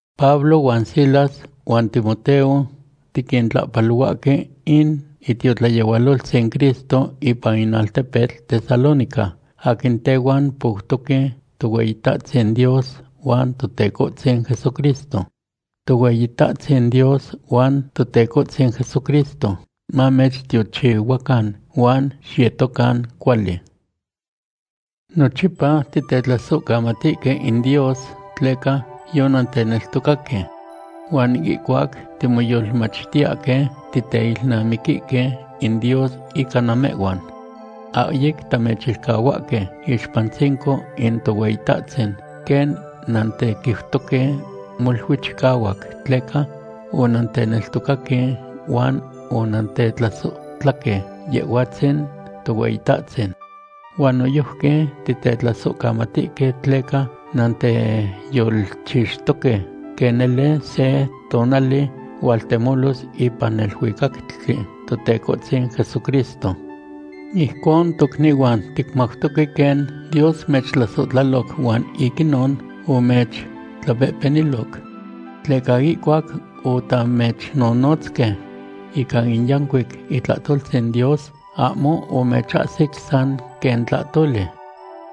Pablo huan Silas huan Timoteo tiquintlahpalohuahque in itiotlayehualoltzin Cristo ipan in altepetl Tesalónica aquin tehuan poutoque Tohueyitahtzin Dios huan Totecohtzin Jesucristo. Tohueyitahtzin Dios huan Totecohtzin Jesucristo mamechtiochihuacan huan xiyetocan cuali. Nochipa titetlasohcamatihque in Dios tleca yonanteneltocaque. Huan ihcuac timoyolmachtiyahque, titeilnamiquihque in Dios ica namehhuan. Ahyic tamechilcahuahque iixpantzinco in Tohueyitahtzin quen nantequiutoque molui chicahuac tleca onanteneltocaque huan onantetlasohtlahque Yehhuatzin Tohueyitahtzin. Huan noyojqui titetlasohcamatihque tleca nanteyolchixtoque quen nele se tonali hualtemolos ipan neluicactli Totecohtzin Jesucristo. Ijcon tocnihuan, ticmautoque quen Dios mechtlasohtlaloc huan ic inon omechtlapehpeniloc. Tleca ihcuac otamechnonotzque ica in yancuic itlahtoltzin Dios, ahmo omechahsic san quen tlahtoli.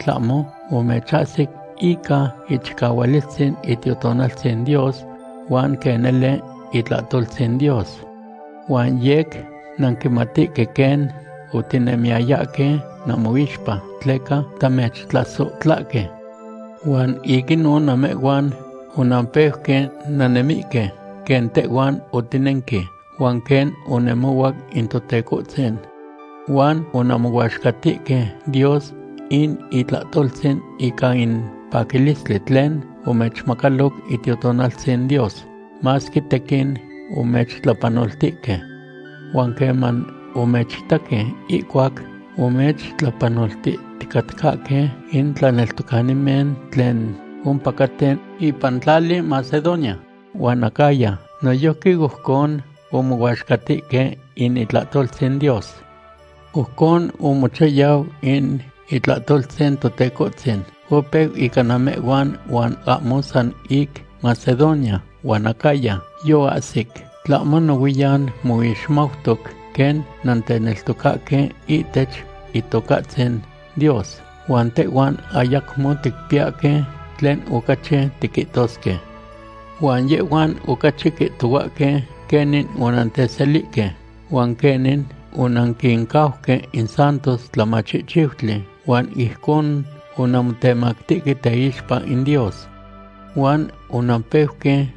Tlahmo omechahsic ica ichicahualistzin Itiotonaltzin Dios huan quen nele itlahtoltzin Dios. Huan yec nanquimatihque quen otinemiyayahque namoixpa tleca tamechtlasohtlahque. Huan ic inon namehhuan onanpeuque nannemihque quen tehhuan otinenque huan quen onemohuac in Totecohtzin. Huan onanmohuaxcatihque Dios in itlahtoltzin ican in paquilistli tlen omechmacaloc Itiotonaltzin Dios, masque tequin omechtlapanoltihque. Huan queman omechitaque ihcuac omechtlapanoltihticatcahque, in tlaneltocanimen tlen ompacaten ipan tlali Macedonia huan Acaya noyojqui ojcon omohuaxcatihque in itlahtoltzin Dios. Ojcon omochayau in itlahtoltzin Totecohtzin. Opeu ica namehhuan, huan ahmo san ic Macedonia huan Acaya yoahsic, tlahmo nohuiyan moixmautoc quen nanteneltocahque ihtech Itocahtzin Dios, huan tehhuan ayacmo ticpiyahque tlen ocachi tiquihtosque. Huan yehhuan ocachi quihtohuahque quenin onantechselihque, huan quenin onanquincauque in santos tlamachihchiutli huan ijcon onanmotemactihque teixpa in Dios. Huan onampeuque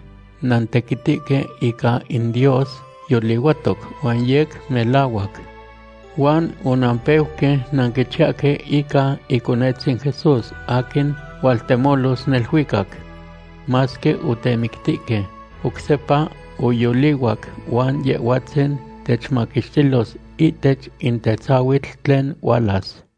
nantequitihque ica in Dios yolihuatoc huan yec melahuac. Huan onampeuque nanquichiyahque ica Iconetzin Jesús aquin hualtemolos neluicac. Masque otemictihque, oc sepa oyolihuac huan Yehhuatzin techmaquixtilos ihtech in tetzahuitl tlen hualas.